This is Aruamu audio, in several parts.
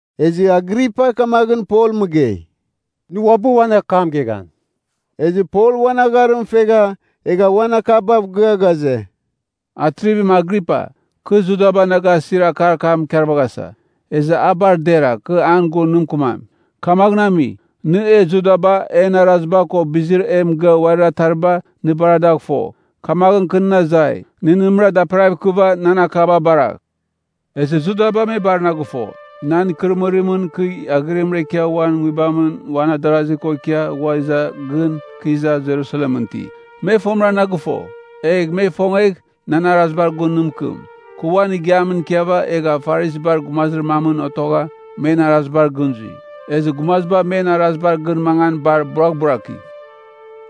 Ezɨ Agripa kamaghɨn Pol mɨgei, “Nɨ uabɨ uan akam geghan.” Ezɨ Pol uan agharim fegha egha uan akabav gɨa ghaze, “Atrivim Agripa, kɨ Judaba na gasir akar kam ikarvaghasa. Ezɨ a bar dera kɨ an gun nɨ mɨkɨmam. Kamaghɨn ami, nɨ e Judaba en araziba ko bizir e mɨgɨa uarir atariba nɨ bar a dagh fo. Kamaghɨn kɨ nɨn azai, nɨ nɨmɨra daperagh ikɨva nan akaba baragh. “Ezɨ Judaba me bar na gɨfo, nan ikɨrɨmɨrimɨn kɨ aghɨrimɨn ikia uan nguibamɨn uan adarazir ko ikia ghua iza gɨn kɨ iza Jerusalemɨn iti. Me fomɨra na gɨfo, egh me ifongegh, nan arazibar gun nɨ mɨkɨm. Kɨ uan igiamɨn ikiava, egha Farisibar gumazir mamɨn otogha men arazibar gɨn zui. Ezɨ gumaziba men arazibar gɨn mangan bar buraghburaki.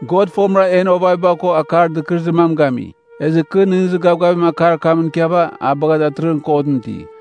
“God fomɨra en ovaviba ko akar dɨkɨrɨzir mam gami. Ezɨ kɨ nɨghnɨzir gavgavim akar kamɨn ikiava a bagha datɨrɨghɨn kotɨn iti.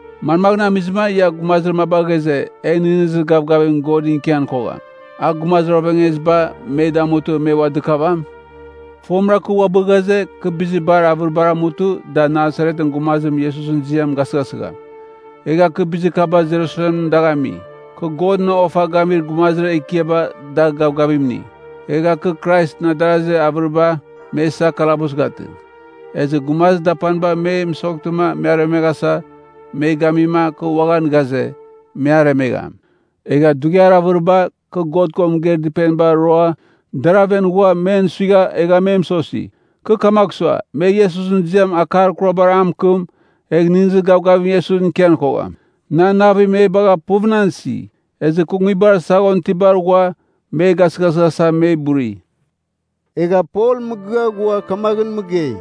“Manmaghɨn amizɨma ia gumazir maba ghaze, e nɨghnɨzir gavgavim God ikian kogham, a gumazir oveaghueziba me damutɨ me ua dɨkavam? “Fomɨra kɨ uabɨ ghaze, kɨ bizir bar avɨribar amutɨ da Nasaretɨn gumazim Iesusɨn ziam gasɨghasɨgham. “Egha kɨ bizir kaba Jerusalemɨn dagh ami. Kɨ Godɨn ofa gamir gumazir ekiaba da gavgavim ini, egha kɨ Kraisɨn adarazir avɨriba me isa kalabus gatɨ. Ezɨ gumazir dapaniba me mɨsoghtɨma aremeghasa me mɨgeima, kɨ uaghan ghaze, me aremegham. Egha dughiar avɨriba kɨ God ko mɨgeir dɨpeniba roa dar aven ghua, men suigha egha me mɨsosi. Kɨ kamagh sua, me Iesusɨn ziam akar kurabar a mɨkɨm, egh nɨghnɨzir gavgavim Iesusɨn ikian kogham. Nan navim me bagha puv nan isi, ezɨ kɨ nguibar saghon itibar ghua me gasɨghasɨghasa me buri.” Egha Pol mɨgɨa ghua kamaghɨn mɨgei,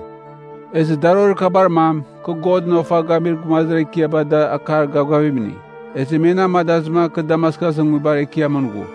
“Ezɨ darorir kabar mam, kɨ Godɨn ofa gamir gumazir ekiaba da akar gavgavim ini, ezɨ me na amadazɨma kɨ Damaskusɨn nguibar ekiamɨn ghu.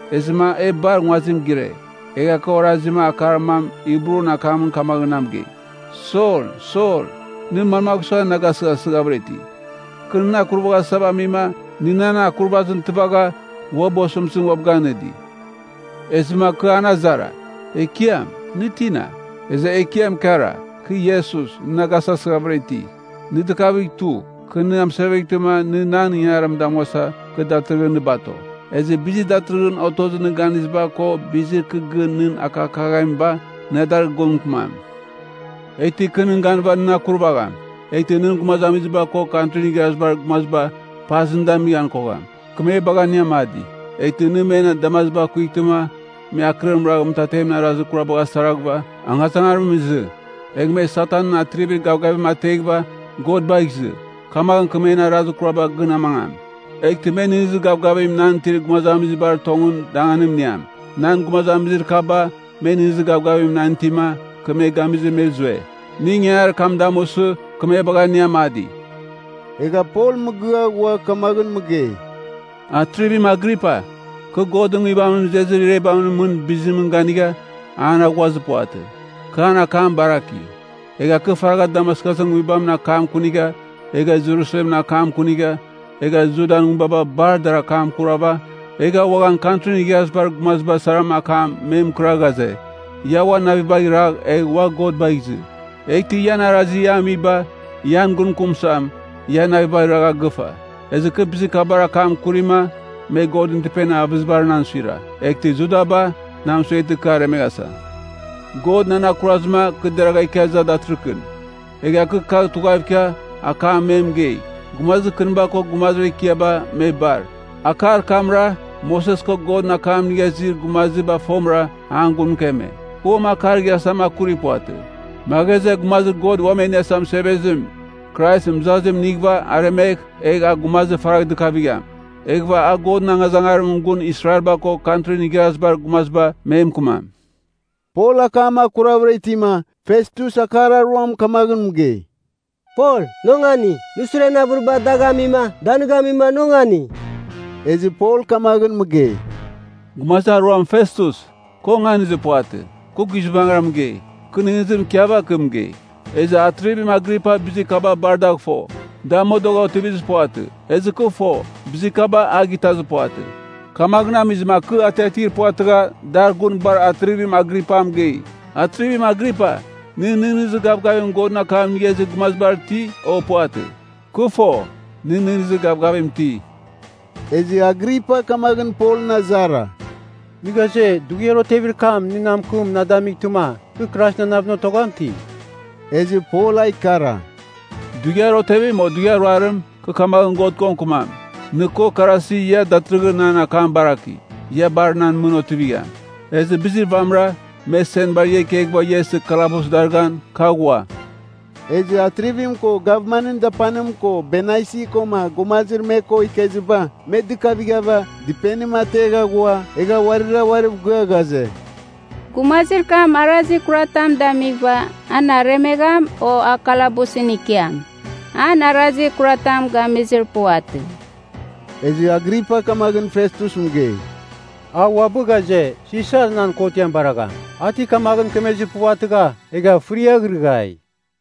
Ezɨma e bar nguazim gire, egha kɨ orazima akar mam Hibrun akamɨn kamaghɨn na mɨgei, ‘Sol, Sol, nɨ manmagh sua na gasɨghasɨghavɨra iti? Kɨ nɨn akurvaghasava amima, nɨ nan akurvazim tɨvagha, uabɨ osɨmtɨzim uabɨ ganɨdi.’ “Ezɨma kɨ an azara, ‘Ekiam, nɨ tina?’ “Ezɨ Ekiam ikara, ‘Kɨ Iesus, nɨ na gasɨghasɨghavɨra iti. Nɨ dɨkavigh tugh. Kɨ nɨ amɨseveghtɨma, nɨ nan ingangarim damuasa, kɨ datɨrɨghɨn nɨ bato. Ezɨ bizir datɨrɨghɨn otozir nɨ ganiziba ko bizir kɨ gɨn nɨn akakaghamiba, na dar gun mɨkɨmam. Eghtɨ kɨ nɨn ganɨva nɨn akurvagham, eghtɨ nɨn gumazamiziba ko Kantrin Igharazibar Gumaziba paza nɨ damighan kogham. Kɨ me bagha nɨ amadi, eghtɨ nɨ men damaziba kuightɨma, me akɨrim ragh mɨtatemɨn arazir kurabagh asaraghɨva, angazangarimɨn izɨ. Egh me Satanɨn atrivir gavgavim ateghɨva, God bagh izɨ. Kamaghɨn kɨ men arazir kuraba gɨn amangam, eghtɨ me nɨghnɨzir gavgavim nan itir gumazamizibar tongɨn danganim iniam. Nan gumazamizir kaba, me nɨghnɨzir gavgavim nan itima, kɨ me gamizɨ me zue. Nɨ ingangarir kam damusɨ, kɨ me bagha nɨ amadi.’” Egha Pol mɨgɨa ghua kamaghɨn mɨgei, “Atrivim Agripa, kɨ Godɨn Nguibamɨn izezir irebamɨn mɨn bizimɨn ganigha an aghuazir puvatɨ, kɨ an akam baraki. Egha kɨ faragha Damaskusɨn nguibamɨn akam akunigha, egha Jerusalemɨn akam akunigha, egha Judan nguibaba bar dar akam akurava, egha uaghan Kantrin Igharazibar Gumaziba sara akam me mɨkɨra ghaze, ‘Ia uan navibagh iragh egh ua God bagh izɨ. Eghtɨ ian arazir ia amiba, ian gun mɨkɨm suam, ia navibagh iragha gɨfa.’ Ezɨ kɨ bizir kabar akam akurima, me Godɨn Dɨpenir avɨzibar nan suira. Eghtɨ Judaba na mɨsueghtɨma kɨ aremeghasa. God nan akurazɨma kɨ deragha ikia iza datɨrɨkɨn, egha kɨ kagh tughav ikia akam me mɨgei, gumazir kɨniba ko gumazir ekiaba me bar. Akar kamra, Moses ko Godɨn akam inigha izir gumaziba fomɨra an gun mɨkeme. Kɨ uam akar igharazitam akuri puvatɨ. Me ghaze, Gumazir God Uam E Iniasa Mɨsevezim, Krais mɨzazim inighɨva aremegh, egh a gumazir faragh dɨkavigham. Eghɨva a Godɨn angazangarimɨn gun Israelba ko Kantrin Igharazibar Gumaziba me mɨkɨmam.” Pol akam akuravɨra itima, Festus akar aruam kamaghɨn mɨgei, “Pol, nɨ ongani! Nɨ suren avɨriba dagh amima, da nɨ gamima nɨ ongani!” Ezɨ Pol kamaghɨn mɨgei, “Gumazir Aruam Festus, kɨ onganizir puvatɨ, kɨ guizbangɨra mɨgei, kɨ nɨghnɨzim ikiava kɨ mɨgei. Ezɨ Atrivim Agripa bizir kaba bar dagh fo, da modogha otivizir puvatɨ, ezɨ kɨ fo, bizir kaba a gitazir puvatɨ. Kamaghɨn amizɨma kɨ atiatir puvatɨgha, dar gun bar Atrivim Agripa mɨgei. Atrivim Agripa, nɨ nɨghnɨzir gavgavim Godɨn akam inigha izir gumazibar iti, o puvatɨ? Kɨ fo, nɨ nɨghnɨzir gavgavim iti.” Ezɨ Agripa kamaghɨn Polɨn azara, “Nɨ ghaze, dughiar otevir kam nɨ na mɨkɨm na damightɨma, kɨ Kraisɨn ananavɨn otogham ti?” Ezɨ Pol a ikara, “Dughiar otevim o dughiar ruarim, kɨ kamaghɨn God ko mɨkɨmam, nɨ ko karasi ia datɨrɨghɨn nan akam baraki, ia bar nan mɨn otivigham. Ezɨ bizir vamɨra, me senbar ia ikeghɨva ia isɨ kalabus darɨghan, kɨ aghua.” Ezɨ Atrivim ko gavmanɨn dapanim ko Bernaisi koma gumazir me ko ikeziba, me dɨkavighava dɨpenim ategha ghua, egha uarira uariv gɨa ghaze, “Gumazir kam arazir kuratam damighɨva, an aremegham, o a kalabusɨn ikiam. An arazir kuratam gamizir puvatɨ.” Ezɨ Agripa kamaghɨn Festus mɨgei, “A uabɨ ghaze, Sisar nan kotiam baragham. A ti kamaghɨn mɨkemezir puvatɨgha, egha fɨriaghrɨghai.”